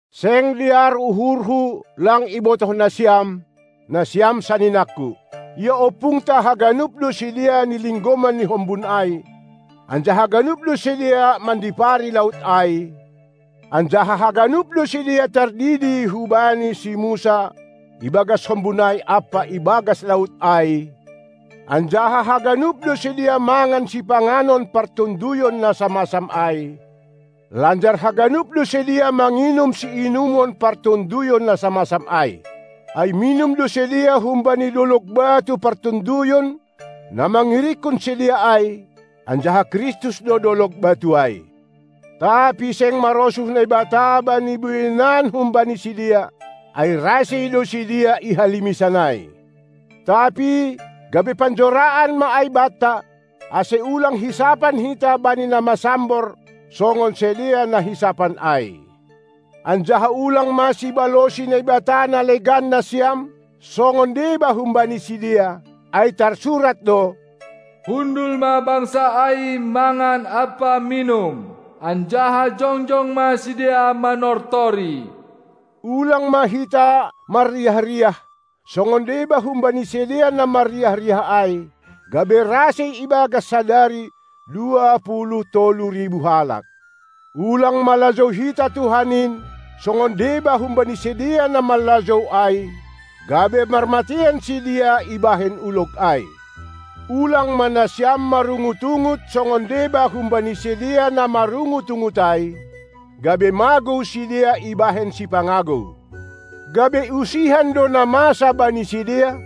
Seng dear uhurhu lang ibotoh nasiam, nasiam saninangku; Ia ompungta haganup do sidea nilinggoman ni hombun ai, anjaha ganup do sidea mandipari laut ai, anjaha haganup do sidea tardidi hubani si Musa ibagas hombun ai ampa ibagas laut ai, anjaha haganup do sidea mangan sipanganon partonduyon na samasam ai, lanjar haganup do sidea manginum siinumon partonduyon na samasam ai. Ai minum do sidea humbani dolog batu partonduyon na mangirikkon sidea ai, anjaha Kristus do dolog batu ai. Tapi seng marosuh Naibata bani bueinan humbani sidea, ai rasei do sidea i halimisan ai. Tapi gabe panjoraan ma ai banta, ase ulang hisapan hita bani na masambor songon sidea na hisapan ai. Anjaha ulang ma sibalosi naibata na legan nasiam songon deba humbani sidea, ai tarsurat do: Hundul ma bangsa ai mangan ampa minum, anjaha jongjong ma sidea manortori. Ulang ma hita marriah-riah, songon deba humbani sidea na marriah-riah ai, gabe rasei ibagas sadari dua puluh tolu ribu halak. Ulang ma lajou hita Tuhan in songon deba humbani sidea na manlajou ai, gabe marmateian sidea ibahen ulog ai. Ulang ma nasiam marungut-ungut songon deba humbani sidea na marungut-ungut ai, gabe magou sidea ibahen sipangagou. Gabe usihan do na masa bani sidea,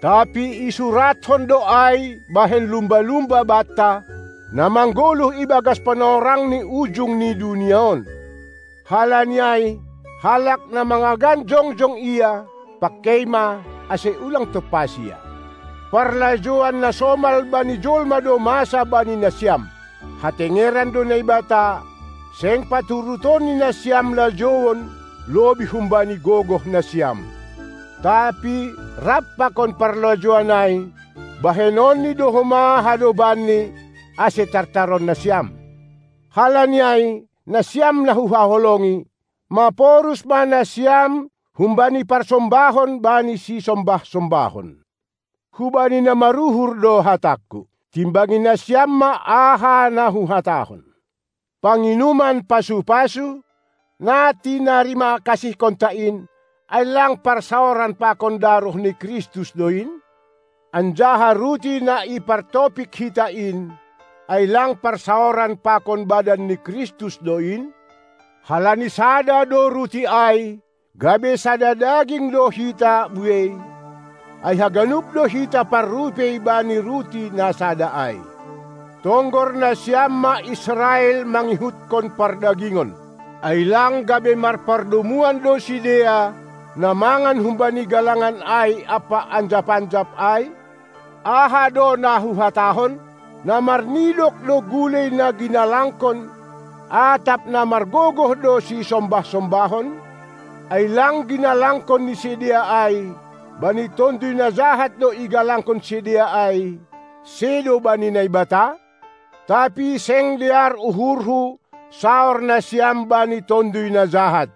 tapi isurathon do ai bahen lumba-lumba banta, na manggoluh ibagas panorang ni ujung ni dunia on. Halani ai, halak na mangagan jongjong ia, pangkei ma, ase ulang tompas ia. Parlajouan na somal bani jolma do masa bani nasiam: Hatengeran do Naibata, seng paturutonNi nasiam lajouon lobih humbani gogoh nasiam; tapi rap pakon parlajouan ai bahenonni do homa hadobanni, ase tartaron nasiam. Halani ai, nasiam na huhaholongi, maporus ma nasiam humbani parsombahon bani sisombah-sombahon. Hubani na maruhur do hatangku. Timbangi nasiam ma aha na huhatahon. Panginuman pasu-pasu, na tinarima kasihkonta in, ai lang parsaoran pakon daroh ni Kristus do in? Anjaha ruti na ipartopik hita in, ai lang parsaoran pakon badan ni Kristus do in? Halani sada do ruti ai, gabe sada daging do hita buei, ai haganup do hita parrupei bani ruti na sada ai. Tonggor nasiam ma Israel mangihutkon pardagingon! Ai lang gabe marpardomuan do sidea, na mangan humbani galangan ai ampa anjap-anjap ai? Aha do na huhatahon? Na marnidok do gulei na ginalangkon, atap na margogoh do sisombah-sombahon? Ai lang ginalangkon ni sidea ai, bani tonduy na jahat do igalangkon sidea ai, sedo bani Naibata? Tapi seng dear uhurhu saor nasiam bani tonduy na jahat.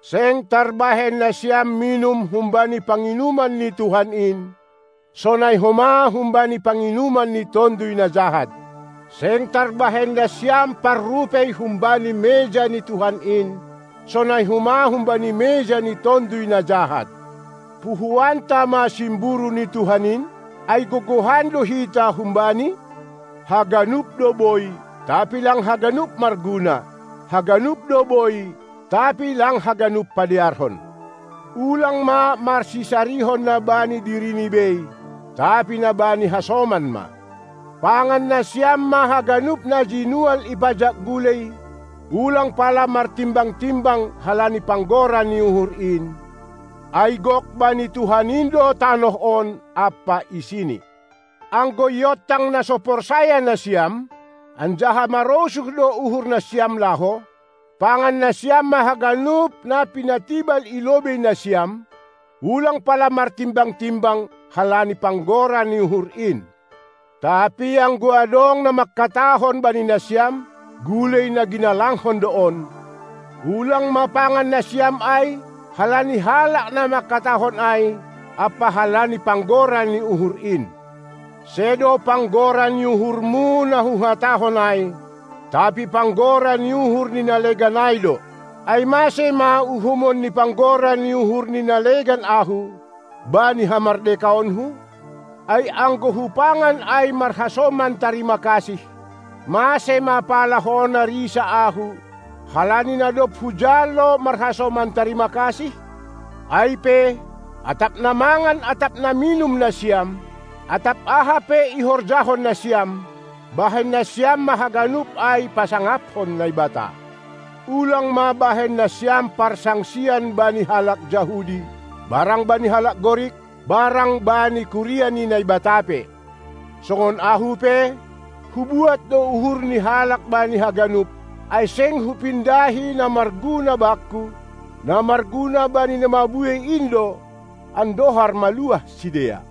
Seng tarbahen nasiam minum humbani panginuman ni Tuhan in, sonai homa humbani panginuman ni tonduy na jahat. Seng tarbahen nasiam parrupei humbani meja ni Tuhan in, sonai homa humbani meja ni tonduy na jahat. Puhoanta ma simburu ni Tuhan in? Ai gogohan do hita hum-Bani? Haganup do boi, tapi lang haganup marguna. Haganup do boi, tapi lang haganup padearhon. Ulang ma marsisarihon na bani dirini bei, tapi na bani hasoman ma. Pangan nasiam ma haganup na jinual i pajak gulei, ulang pala martimbang-timbang halani panggora ni uhur in, ai gok bani Tuhan in do tanoh on ampa isini. Anggo iontang na so porsaya nasiam, anjaha marosuh do uhur nasiam laho, pangan nasiam ma haganup na pinatibal i lobei nasiam, ulang pala martimbang-timbang halani panggora ni uhur in! Tapi anggo adong na mangkatahon bani nasiam: "Gulei na ginalangkon do on," ulang ma pangan nasiam ai, halani halak na mangkatahon ai, ampa halani panggora ni uhur in. Sedo panggora ni uhurmu na huhatahon ai, tapi panggora ni uhur ni na legan ai do. Ai mase ma uhuman ni panggora ni uhur ni na legan ahu, bani hamardekaonku? Ai anggo hupangan ai marhasoman tarima kasih, mase ma pala hona risa ahu, halani na dob hujalo marhasoman tarima kasih? Ai pe, atap na mangan atap na minum nasiam, atap aha pe ihorjahon nasiam, bahen nasiam ma haganup ai pasangaphon Naibata. Ulang ma bahen nasiam parsangsian bani halak Jahudi, barang bani halak Gorik, barang bani kuria ni Naibata pe. Songon ahu pe, hubuat do uhur ni halak bani haganup, ai seng hupindahi na marguna bakku, na marguna bani na mabuei in do, andohar maluah sidea.